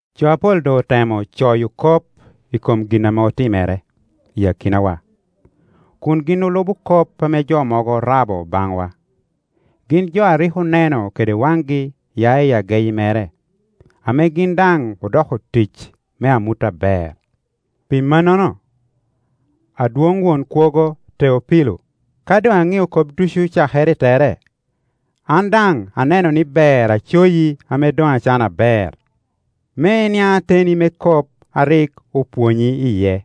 Jo apol doŋ otemo coyo kop i kom gin ame otimere i akinawa, kun gin olubo kop ame jo mogo orabo baŋwa, gin jo a rik oneno kede waŋgi ya i ageyi mere, ame gin daŋ odoko otic me amut aber. Pi mannono, Adwoŋ Won Kwogo Teopilo, ka doŋ aŋio kop ducu cakere i tere, an daŋ aneno ni ber acoyi ame doŋ acano aber, me iniaŋ ateni me kop a rik opwonyi iye.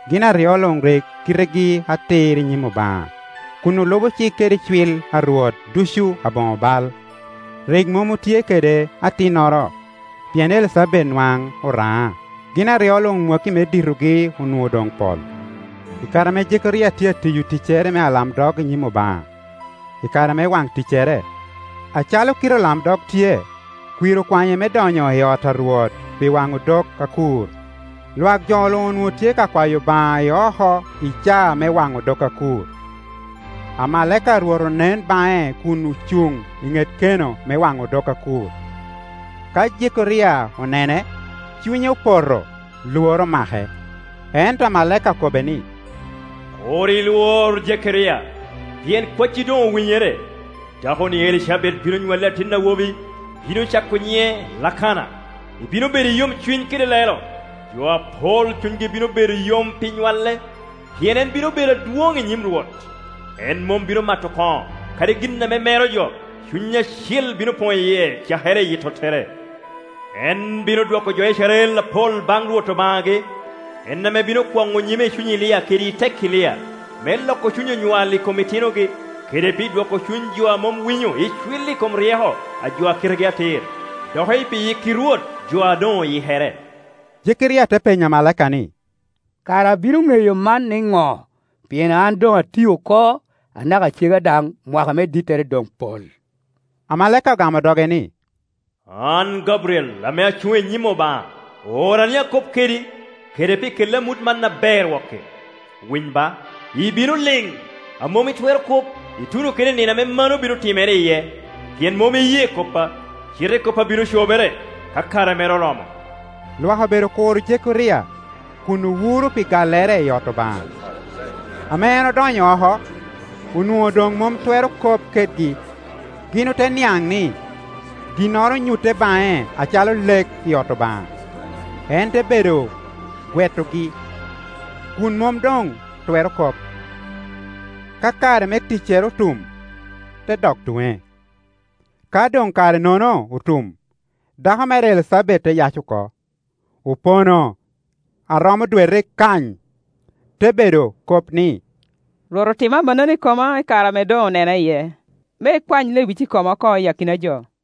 Gin aryo luŋ rik kitegi atir i nyim Obaŋa, kun olubo cik kede icwil a Rwot ducu aboŋo bal. Rik mom otye kede atinnoro, pien Elicabet nwaŋ oraŋa, gin aryo luŋ mwakki me ditogi onwoŋo doŋ pol. I kare ame Jekeria tye a tiyo ticcere me alamdog i nyim Obaŋa, i kare me waŋ ticcere, acalo kite olamdog tye, kwir okwanye me donyo i ot a Rwot pi waŋo odok akur. Lwak jo luŋ onwoŋo tye ka kwayo Obaŋa i oko i caa me waŋo odok akur. Amalaika a Rwot onen baŋe kun ocuŋ i ŋet keno me waŋo odok akur. Ka Jekeria onene, cunye opoto, lworo omake. Ento amalaika okobbe ni, “Kur ilwor, Jekeria, pien kwacci doŋ owinyere, dakoni Elicabet bino nywalli atin awo bi, ibino cako nyiŋe Lakana. Ibino bedo i yomcuny kede lelo, jo apol cunygi bino bedo yom pi nywale; pien en bino bedo adwoŋ i nyim Rwot. En mom bino mato koŋo, kadi gin ame mero jo; Cuny Acil bino poŋ i yie, cakere i yi tottere. En bino dwoko jo Icrael apol baŋ Rwot Obaŋagi; en ame bino kwoŋo nyime i cuny Elia kede i tek Elia, me loko cuny onywal i kom itinogi, kede pi dwoko cuny jo a mom winyo icwil i kom ryeko a jo a kitegi atir, doki pi yikki Rwot jo a doŋ oyikere,” Jekeria te penyo amalaika ni, “Kara abino ŋeyo man niŋo? Pien an doŋ ati oko, anaka cega daŋ mwaka me dittere doŋ pol” Amalaika ogamo doge ni, “An Gabriel, ame acuŋ i nyim Obaŋa; oora ni akob kedi, kede pi kelli amut man aber wok-ki. Winy ba, ibino liŋ, a mom itwero kop, ituno kede i nino ame mano bino timere iye, pien mom iye koppa; cite koppa bino cobere, ka kare mere oromo.” Lwak obedo kuro Jekeria, kun owuro pi gallere i ot Obaŋa. Ame en odonyo oko, onwoŋo doŋ mom twero kop kedgi; gin ote niaŋ ni, ginnoro onyutte baŋe acalo lek i ot Obaŋa. En te bedo gwetogi, kun mom doŋ twero kop. Ka kare me ticcere otum, te dok tuŋe. Ka doŋ kare-nono otum, dako mere Elicabet te yac oko. Opono a romo dwete kany, te bedo kop ni, “Rwot otimo amannono i koma i kare ame doŋ onena iye, me ekwany lewic i koma oko i akina jo.”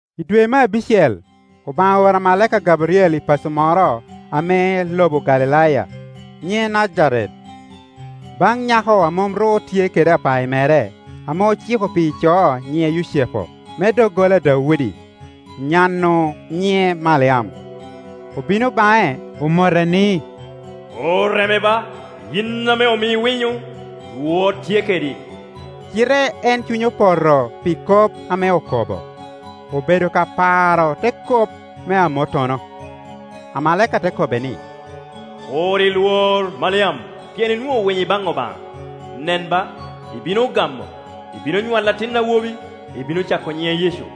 I dwe me abicel, Obaŋa ooro amalaika Gabriel i paco moro ame i lobo Galilaya, nyiŋe Najaret, baŋ nyako a mom ru tye kede apayi mere, ame ociko pi ico a nyiŋe Yucepu me doggola a Daudi; nyan-nu nyiŋe Maliam. Obino baŋe, omote ni, “Oreme ba, yin ame omii winyo, Rwot tye kedi!” Cite en cunye opoto pi kop ame okobo; obedo ka paro te kop me amottono. Amalaika te kobbe ni, “Kur ilwor, Maliam, pien inwoŋo winyo ibaŋ Obaŋa. Nen ba, ibino gamo, ibino nywalo atin awobi, ibino cako nyiŋe Yecu.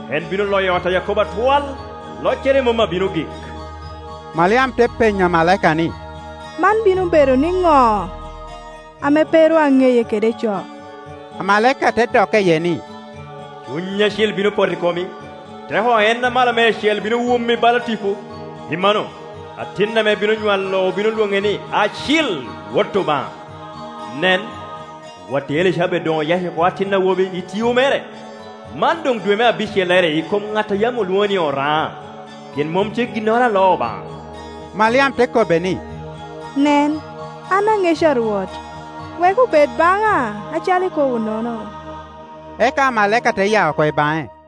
En bino loyo ot a Yakobo atwal, loccere mom abino gik,” Maliam te penyo amalaika ni, “Man bino bedo niŋo, ame pe ru aŋeye kede ico?” Amalaika te dokke iye ni, “Cuny Acil bino poto i komi, teko a En Amalo Meicel bino wumi bala tipo; pi manno, atin ame ibino nywalo obino lwoŋe ni, Acil, Wot Obaŋa. Nen, watti Elicabet doŋ oyac oko atin awobi, i tio mere; man doŋ dwe me abicellerie i kom ŋat a yam olwonŋo ni oraŋa. Pien mom tye ginnoro a loo Obaŋa.” Maliam te kobo ni, “Nen, an aŋeca a Rwot; wek obed baŋa acalo ikobo-nono.” Eka amalaika te ya oko baŋe.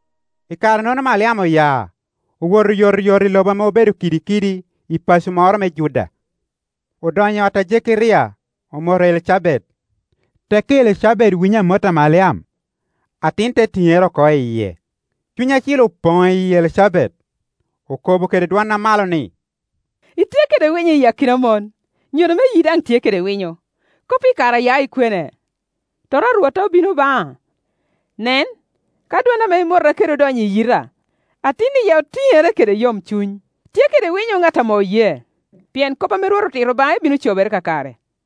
I kare-nono Maliam oya, owoto oyotoyot i lobo ame obedo kidikidi, i paco moro me Juda, odonyo i ot a Jekeria, omoto Elicabet. Tekki Elicabet winyo amot a Maliam, atin te tiŋere oko i yie. Cuny Acil opoŋ i yi Elicabet, okobo kede dwon amalo ni, “Itye kede winyo i akina mon, nyodo me yii daŋ tye kede winyo! Kop-pi kara ya ikwene, tota a Rwotta obino baŋa? Nen, ka dwon ame imota kede odonyo i yita, atin i yia otiŋere kede yomcuny. Tye kede winyo ŋat ame oye, pien kop ame Rwot otito baŋe bino cobere kakare.”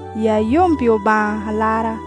yia yom pi Obaŋa Alarra,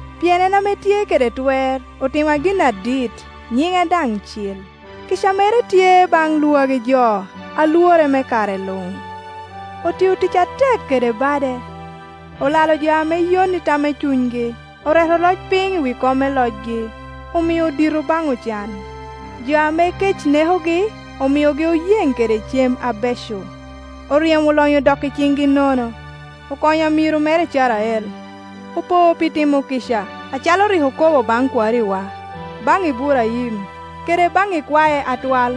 pien en ame tye kede twer otima gin adit nyiŋe daŋ cil. Kica mere tye baŋ lwagi jo lwore me lare luŋ. Otia tic atek kede bade, olalo jo ame yon i tam me cunygi; oreto oloc piny i wi kome locgi, omio dito baŋ ocan. Jo ame kec nekogi omiogi oyeŋ kede cem abeco, oryemo olonyo odok i ciŋgi nono. Okonyo amiro mere Icrael, opo pi timo kica, acalo rik okobo baŋ kwariwa, baŋ Iburaim kede baŋ ikwae atwal.”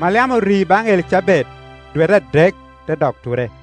Maliam ori baŋ Elicabet dwete adek, te dok ture.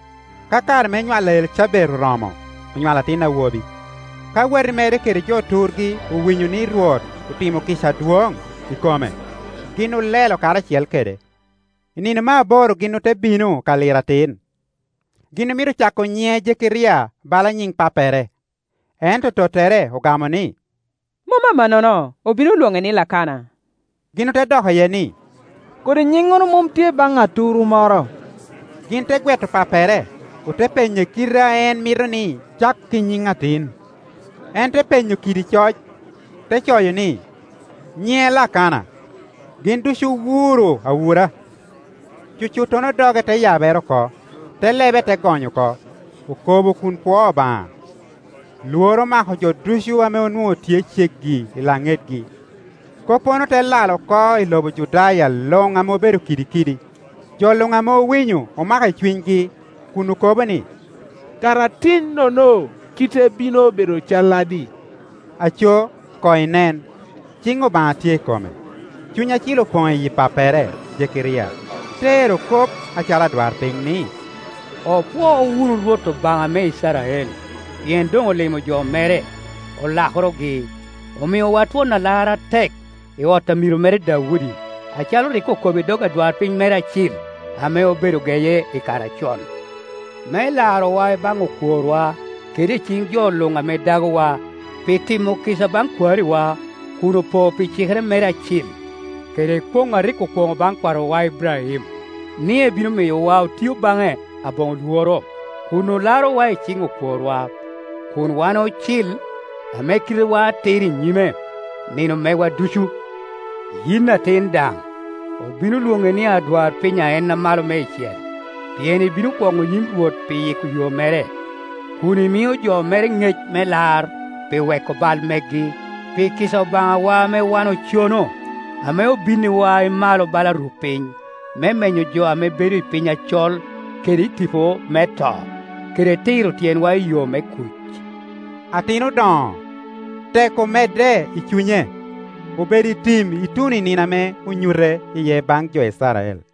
Ka kare me nywal a Elicabet oromo, onywalo atin awobi. Ka wati mere kede jo turgi owinyo ni Rwot otimo kica adwoŋ i kome, gin olelo karacel kede. I nino me aboro gin ote bino ka liro atin. Gin omito cako nyiŋe Jekeria bala nyiŋ pappere, ento tottere ogame ni, “Mom amannono, obino lwoŋe ni, Lakana.” Gin ote dok iye ni, “Kodi nyiŋŋono mom tye baŋ aturu moro.” Gin te gweto pappere, ote penye kite a en mito ni cak i nyiŋ atin. En te penyo kidi coc, ti coyo ni, “Nyiŋe Lakana.” Gin ducu owuro awura. Cucuttono doge te yabere oko, te lebe te gony oko, okobo kun pwoo Obaŋa. Lworo omako jo ducu ame onwoŋo tye ceggi i laŋetgi, koppono te lal oko i lobo Judaya luŋ ame obedo kidikidi. Jo luŋ ame owinyo omako i cunygi, kun okobo ni, “Kara atin-nono kite bino bedo calladi?” Aco, koŋ inen, ciŋ Obaŋa tye i kome. Cuny Acil opoŋ i yi pappere Jekeria, te ero kop acalo adwarpiny ni, “Opwo wunu Rwot Obaŋa me Icrael, pien doŋ olimo jo mere, olakorogi. Omiowa twon Alar atek, i ot amiro mere Daudi, acalo rik okobo i dog, adwarpiny mere acil, ame obedo geye i kare acon, me larowa i baŋ okworwa, kede i ciŋ jo luŋ ame dagowa, pi timo kica baŋ kwariwa, kun opo pi cikere mere acil, kede kwoŋ a rik okwoŋo baŋ kwarowa Iburaim, ni ebino miyowa otio baŋe aboŋo lworo, kun olarowa i ciŋ okworwa, kun wan ocil, ame kitewa atir i nyime, nino megwa ducu. Yin atin daŋ, obino lwoŋi ni adwarpiny a En Amalo Meicel, pien ibino kwoŋo nyim Rwot pi yiko yo mere, kun imio jo mere ŋec me lar, pi weko bal megi, pi kica Obaŋawa ame wan ocono, ame obinniwa i malo bala rupiny, me menyo jo ame bedo i piny acol kede i tipo me to, kede tiro tyenwa i yo me kuc.” Atin odoŋo, tek omedde i cunye, obedo i tim ituno i nino ame onyute iye baŋ jo Icrael.